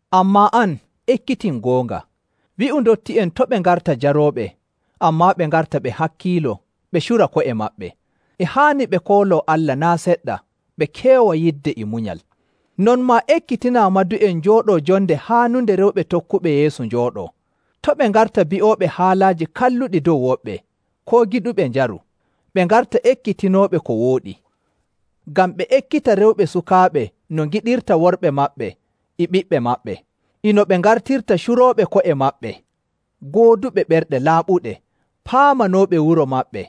Ammaa an, ekkitin goonga. Wi'u ndotti'en to' ɓe ngarta jarooɓe, ammaa ɓe ngarta ɓe hakkiilo, ɓe cura ko'e maɓɓe. E haani ɓe kooloo Allah naa' seɗɗa, ɓe keewa yidde e munyal. Non maa ekkitinaa madu'en njooɗoo jonde haanunde rewɓe tokkuɓe Yeesu njooɗoo. To' ɓe ngarta bi'ooɓe haalaaji kalluɗi dow woɓɓe, koo giɗuɓe njaru. Ɓe ngarta ekkitinooɓe ko wooɗi, ngam ɓe ekkita rewɓe sukaaɓe no ngiɗirta worɓe maɓɓe e ɓiɓɓe maɓɓe, e no ɓe ngartirta curooɓe ko'e maɓɓe, gooduɓe ɓerɗe laaɓuɗe, paamanooɓe wuro maɓɓe,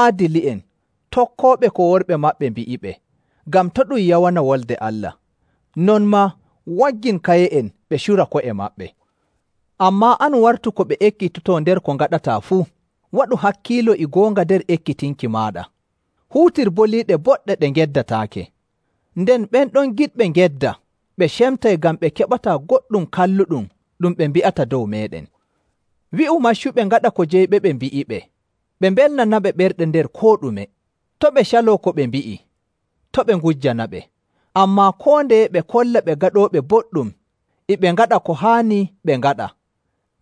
aadili'en, tokkooɓe ko worɓe maɓɓe mbi'iɓe, ngam to' ɗum yawana Wolde Allah. Non maa waggin kaye'en ɓe cura ko'e maɓɓe. Ammaa an wartu ko ɓe ekkitotoo nder ko ngaɗataa fuu. Waɗu hakkiilo e goonga nder ekkitinki maaɗa. Huutir boliiɗe boɗɗe ɗe ngeddataake. Nden ɓen ɗon giɗɓe ngedda ɓe cemtay ngam ɓe keɓataa goɗɗum kalluɗum ɗum ɓe mbi'ata dow meeɗen. Wi'u maccuɓe ngaɗa ko jeyɓeɓe mbi'iɓe, ɓe mbelnanaɓe ɓerɗe nder koo ɗume. To' ɓe caloo ko ɓe mbi'i, to' ɓe ngujjanaɓe. Ammaa koo ndeye ɓe kolla ɓe gaɗooɓe boɗɗum e ɓe ngaɗa ko haani ɓe ngaɗa,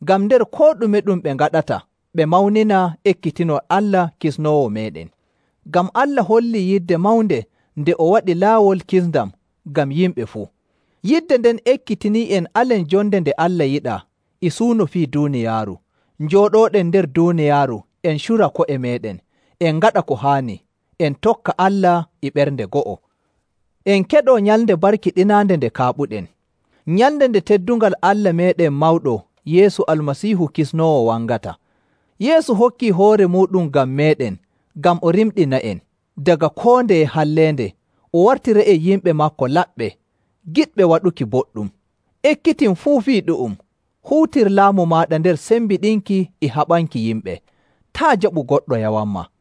ngam nder koo ɗume ɗum ɓe ngaɗata ɓe mawnina ekkitinol Allah Kisnoowo meeɗen. Ngam Allah hollii yidde mawnde nde o waɗi laawol kisndam ngam yimɓe fuu. Yidde nden ekkitinii'en alen jonde nde Allah yiɗaa e suuno fii duuniyaaru, njooɗooɗen nder duuniyaaru en cura ko'e meeɗen, en ngaɗa ko haani, en tokka Allah e ɓernde go'o. En keɗoo nyalnde barkiɗinaande nde kaaɓuɗen, nyalnde nde teddungal Allah meeɗen mawɗo Yeesu Almasiihu Kisnoowo wangata. Yeesu hokkii hoore muuɗum ngam meeɗen ngam o rimɗina'en daga koo ndeye halleende, o wartira'en yimɓe maako laɓɓe, giɗɓe waɗuki boɗɗum. Ekkitin fuu fii ɗu'um, huutir laamu maaɗa nder sembiɗinki e haɓanki yimɓe. Taa' jaɓu goɗɗo yawanmaa.